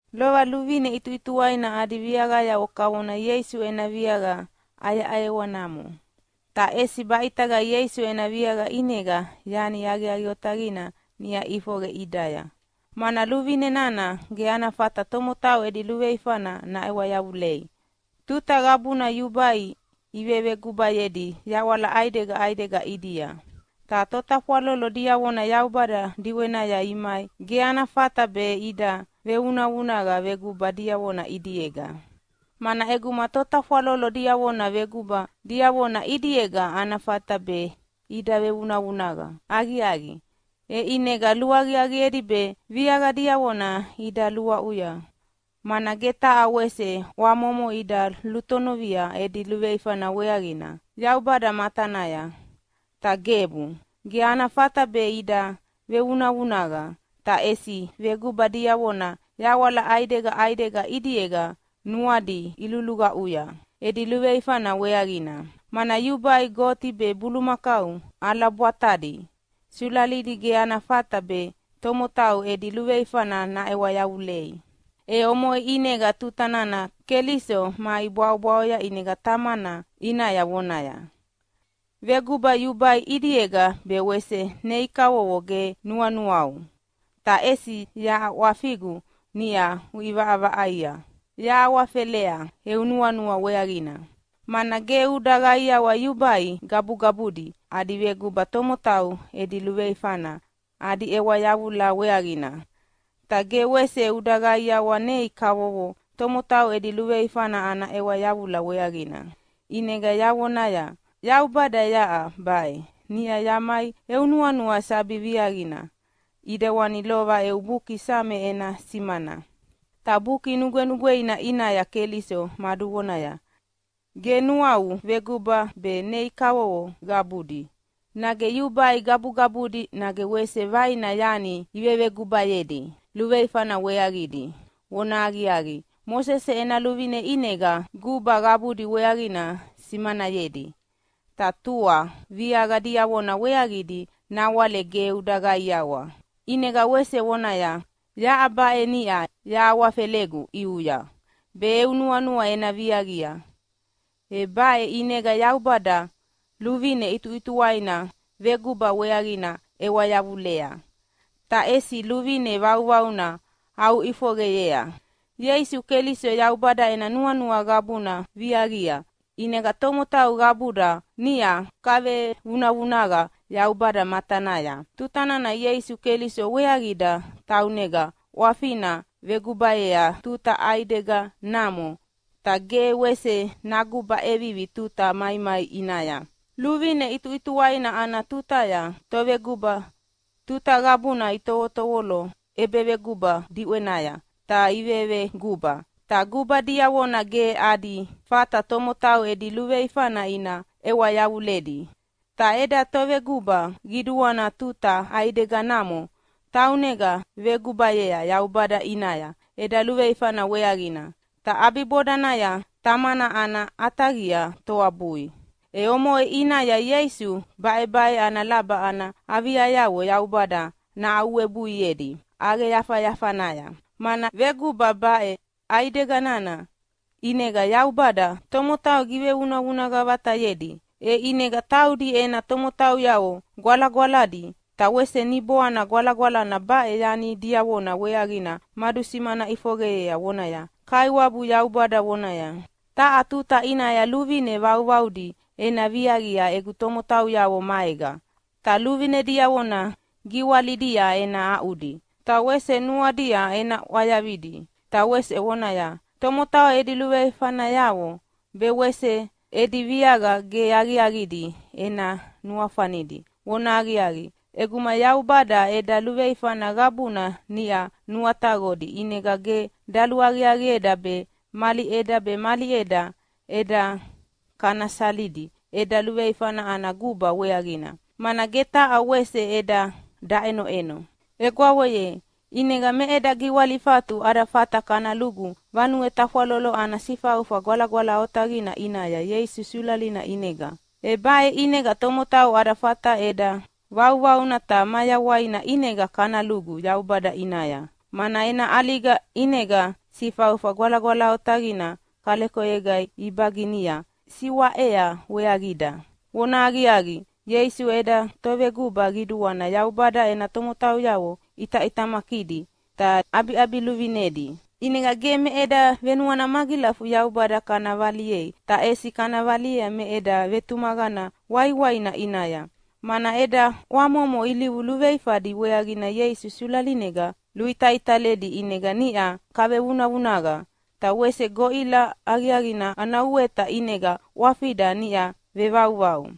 Lova luvine ʼituʼituwaina adi viaqayavo kavona Ieisu ena viaqa ʼayeʼayewanamo, ta ʼesi baʼitaga Ieisu ena viaqa ʼinega yani aqiaqi otaqina niʼa ʼifoqe ʼidaya. Mana luvine nana ge ana fata tomotau edi luveifana naʼewa yavulei. Tuta qabuna yubai ivevegubayedi yaʼwala ʼaidega ʼaidega ʼidia, ta totafwalolo diavona Yaubada diʼwenaya imai ge ana fata be ida vevunavunaqa veguba diavona ʼidiega. Mana ʼeguma totafwalolo diavona veguba diavona ʼidiega ana fata be ida vevunavunaqa aqiaqi, e ʼinega luaqiaqiedi be viaqa diavona ida luaʼuya, mana ge taha wese ʼwamomo ida lutonovia edi luveifana weaqina Yaubada matanaya. Ta gebu, ge ana fata be ida vevunavunaqa! Ta ʼesi veguba diavona yaʼwala ʼaidega ʼaidega ʼidiega nuadi iluluqaʼuya edi luveifana weaqina, mana yubai goti be bulumakau ʼalabwatadi sulalidi ge ana fata be tomotau edi luveifana naʼewa yavulei. E omoʼe ʼinega tuta nana Keliso mai bwaʼobwaʼoya ʼinega Tamana ʼinaya vonaya, “Veguba yubai ʼidiega be wese nei kavovo ge nuanuau, ta ʼesi yaʼa ʼwafigu niʼa uʼivaʼavaʼaia yahawafelea eu nuanua weaqina, mana ge uda qaiawa yubai gabugabudi adi veguba tomotau edi luveifana adi ʼewa yavula weaqina. Ta ge wese uda qaiawa nei kavovo tomotau edi luveifana ana ʼewa yavula weaqina. ʼInega yavonaya, ‘Yaubada yaʼa baʼe. Niʼa yamai eu nuanua sabi viaqina ʼidewani lova eu Buki Same ena simana.’” Ta Buki Nugwenugweina ʼinaya Keliso maduvonaya, “Ge nuau veguba be nei kavovo qabudi, nage yubai gabugabudi nage wese vaina yani ivevegubayedi luveifana weaqidi.” (Vonahaqiaqi, Mosese ena luvine ʼinega guba qabudi weaqina simanayedi, ta tua viaqa diavona weaqidi nawale ge uda qaiawa.) ʼInega wese vonaya, “Yaʼa baʼe, niʼa yahawafelegu ʼiuya be eu nuanua ena viaqia.” E baʼe ʼinega Yaubada luvine ʼituʼituwaina veguba weaqina ʼewa yavulea, ta ʼesi luvine vauvauna aʼuʼifoqeyea. Ieisu Keliso Yaubada ena nuanua qabuna viaqia. ʼInega tomotau qabuda niʼa kavevunavunaqa Yaubada matanaya tuta nana Ieisu Keliso weaqida taunega ʼwafina vegubayea tuta ʼaideganamo, ta ge wese naguba ʼevivi tuta maimai ʼinaya. Luvine ʼituʼituwaina ana tutaya toveguba tuta qabuna itovotovolo ʼebeveguba diʼwenaya ta iveveguba. Ta guba diavona ge adi fata tomotau edi luveifana ina ʼewa yavuledi. Ta eda Toveguba Qiduana tuta ʼaideganamo taunega vegubayea Yaubada ʼinaya eda luveifana weaqina. Ta ʼabibodanaya Tamana ana ʼataqia toabui. E omoʼe ʼinaya Ieisu baʼebaʼe ana laba ana aviayavo Yaubada nahaʼuwebuiedi ʼaqeyafayafanaya. Mana veguba baʼe ʼaidega nana ʼinega Yaubada tomotau givevunavunaqa vatayedi, e ʼinega taudi ena tomotauyavo gwalagwaladi. Ta wese Niboana Gwalagwalana baʼe yani diavona weaqina madusimana ʼifoqeyea vonaya, “Kaiwabu Yaubada vonaya, ‘Taha tuta ʼinaya luvine vauvaudi ena viaqia egu tomotauyavo maega, ta luvine diavona giwalidia ena aʼudi, ta wese nuadia ena ʼwayavidi.’ Ta wese vonaya, ‘Tomotau edi luveifanayavo be wese edi viaqa ge aqiaqidi ena nuafanidi.’” Vonahaqiaqi, ʼeguma Yaubada eda luveifana qabuna niʼa nuataqodi ʼinega ge daluaqiaqieda be mali ʼeda be mali ʼeda kana salidi eda luveifana ana guba weaqina, mana ge taha wese ʼeda daʼenoʼeno. Egwavo ye, ʼinega me eda giwalifatu ada fata kana lugu Vanue Tafwalolo ana Sifaufa Gwalagwala Otaqina ʼinaya Ieisu sulalina ʼinega. E baʼe ʼinega tomotau ada fata ʼeda vauvauna ta mayawaina ʼinega kana lugu Yaubada ʼinaya, mana ena ʼaliga ʼinega Sifaufa Gwalagwala Otaqina kalekoyega ibaginia siwaʼea weaqida. Vonahaqiaqi, Ieisu eda Toveguba Qiduana Yaubada ena tomotauyavo ʼitaʼitamakidi ta ʼabiʼabiluvinedi, ʼinega ge me eda venuana magilafu Yaubada kana valiei, ta ʼesi kana valia me eda vetumaqana waiwaina ʼinaya, mana eda ʼwamomo ilivu luveifadi weaqina Ieisu sulalinega luitaitalidi ʼinega niʼa kavevunavunaqa, ta wese goʼila aqiaqina ana uweta ʼinega ʼwafida niʼa vevauvau.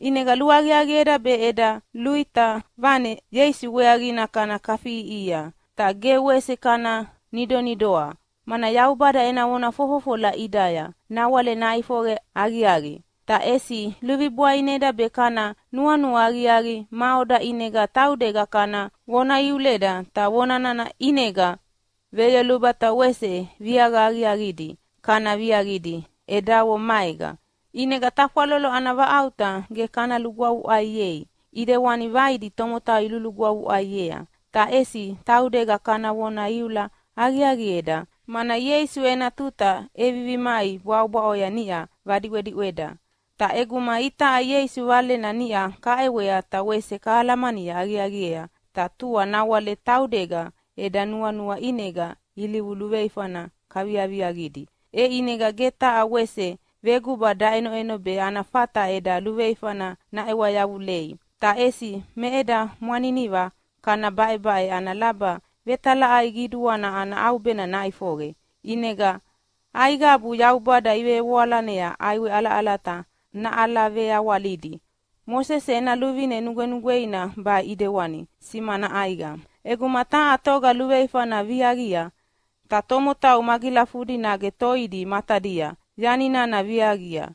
ʼInega luaqiaqieda be eda luʼita vane Ieisu weaqina kana kafiʼiʼihia, ta ge wese kana nidonidoa, mana Yaubada ena vona fofofola ʼidaya nawale naʼifoqe aqiaqi. Ta ʼesi luvibwaineda be kana nuanua aqiaqi maʼoda ʼinega taudega kana vona iuleda, ta vona nana ʼinega veyoluba ta wese viaqa aqiaqidi kana viaqidi edavo maega. ʼInega tafwalolo ana vaʼauta ge kana lugwavuʼaiei ʼidewani vaidi tomotau ilulugwavuʼaiea. Ta ʼesi taudega kana vona iula aqiaqieda, mana Ieisu ena tuta ʼevivi mai bwaʼobwaʼoya niʼa vadiʼwediʼweda. Ta ʼeguma itaʼa Ieisu Valena niʼa kaʼewea ta wese kahalamani aqiaqiea ta tua nawale taudega eda nuanua ʼinega ilivu luveifana kaviaviaqidi, e ʼinega ge taha wese veguba daʼenoʼeno be ana fata eda luveifana naʼewa yavulei. Ta ʼesi me eda mwaniniva kana baʼebaʼe ana laba vetalaʼai qiduana ana ʼaubena naʼifoqe, ʼinega aiqabu Yaubada ivevoalanea ʼaiwe ʼalaʼalata naʼalaveawalidi. Mosese ena luvine nugwenugweina baʼe ʼidewana simana ʼaiqa: ʼEguma taha toga luveifana viaqia, ta tomotau magilafudi nage toidi matadia yani nana viaqia,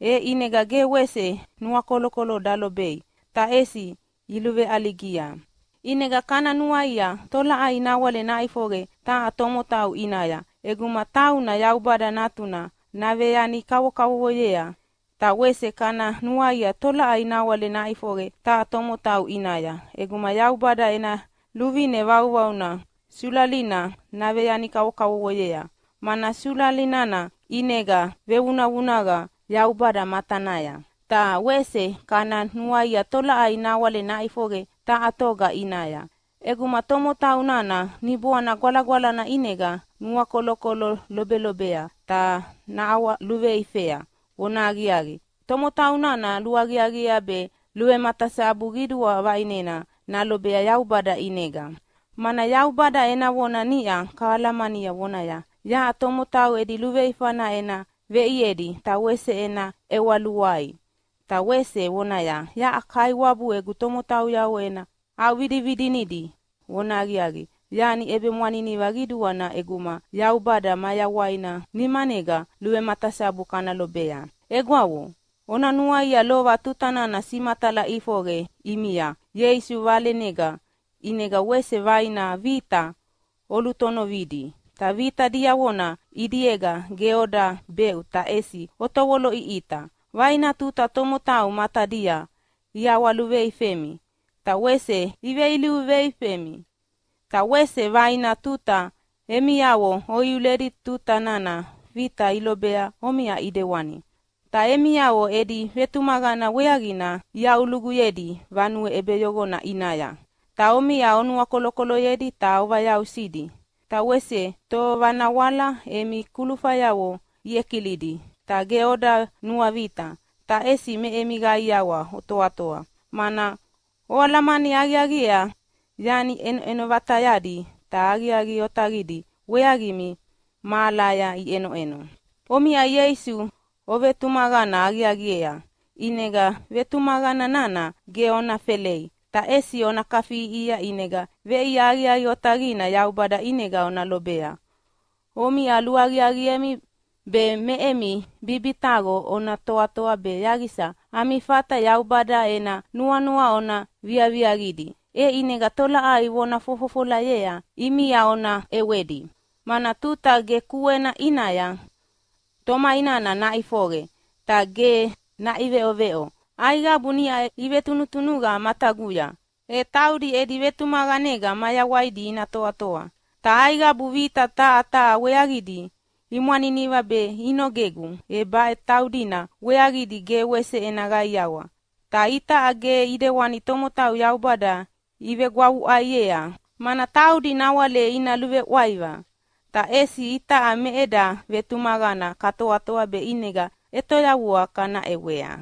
e ʼinega ge wese nuakolokolo dalobei, ta ʼesi iluveʼaligia. ʼInega kana nuaia tolaʼai nawale naʼifoqe taha tomotau ʼinaya ʼeguma tauna Yaubada Natuna naveyani kavokavovoyea? Ta wese kana nuaia tolaʼai nawale naʼifoqe taha tomotau ʼinaya ʼeguma Yaubada ena luvine vauvauna sulalina naveyani kavokavovoyea, mana sulali nana ʼinega vevunavunaqa Yaubada matanaya. Ta wese kana nuaia tolaʼai nawale naʼifoqe taha toga ʼinaya ʼeguma tomotau nana Niboana Gwalagwalana ʼinega nuakolokolo lobelobea ta naʼawaluveifea? Vonahaqiaqi, tomotau nana luaqiaqiea be luvematasabu qidua vaʼinena nalobea Yaubada ʼinega. Mana Yaubada ena vona niʼa kahalamania vonaya, “Yaʼa tomotau edi luveifana ena veʼiedi, ta wese ena ʼewa luai.” Ta wese vonaya, “Yaʼa Kaiwabu egu tomotauyavo ena aʼuvidividinidi.” Vonahaqiaqi, yani ʼebemwaniniva qiduana ʼeguma Yaubada mayawaina nimanega luvematasabu kana lobea. Egwavo, ona nuaia lova tuta nana simatala ʼifoqe ʼimia Ieisu valenega, ʼinega wese vaina vita olutonovidi. Ta vita diavona ʼidiega ge oda beʼu, ta ʼesi otovoloʼiʼita. Vaina tuta tomotau matadia iʼawaluveifemi ta wese iveilivu veifemi. Ta wese vaina tuta emiavo oiuledi tuta nana vita ilobea omiʼa ʼidewani. Ta emiavo edi vetumaqana weaqina iaʼuluguyedi vanue ʼebeyoqona ʼinaya, ta omiʼa onuakolokoloyedi ta ovayausidi. Ta wese tovanawala emi kulufayavo iʼekilidi. Ta ge oda nuavita, ta ʼesi me emi qaiawa otoatoa, mana oalamani aqiaqiea yani ʼenoʼeno vatayadi ta aqiaqi otaqidi weaqimi mahalaya iʼenoʼeno. Omiʼa Ieisu ovetumaqana aqiaqiea, ʼinega vetumaqana nana ge ona felei, ta ʼesi ona kafiʼiʼihia, ʼinega veʼia aqiaqi otaqina Yaubada ʼinega ona lobea. Omiʼa luaqiaqiemi be me emi bibitaqo ona toatoa be yaqisa ami fata Yaubada ena nuanua ona viaviaqidi, e ʼinega tolaʼai vona fofofolayea ʼimia ona ʼewedi. Mana tuta ge kuena ʼinaya, “Tomai nana naʼifoqe, ta ge naʼiveʼoveʼo. Aiqabu niʼa ivetunutunuqa mataguya e taudi edi vetumaqanega mayawaidi ina toatoa. Ta aiqabu vita taha taha weaqidi imwaniniva be inogegu, e baʼe taudina weaqidi ge wese ena qaiawa.” Ta itaʼa ge ʼidewani tomotau Yaubada ivegwavuʼaiea, mana taudi nawale ina luveʼwaiva. Ta ʼesi itaʼa me eda vetumaqana katoatoa be ʼinega ʼetoyavua kana ʼewea.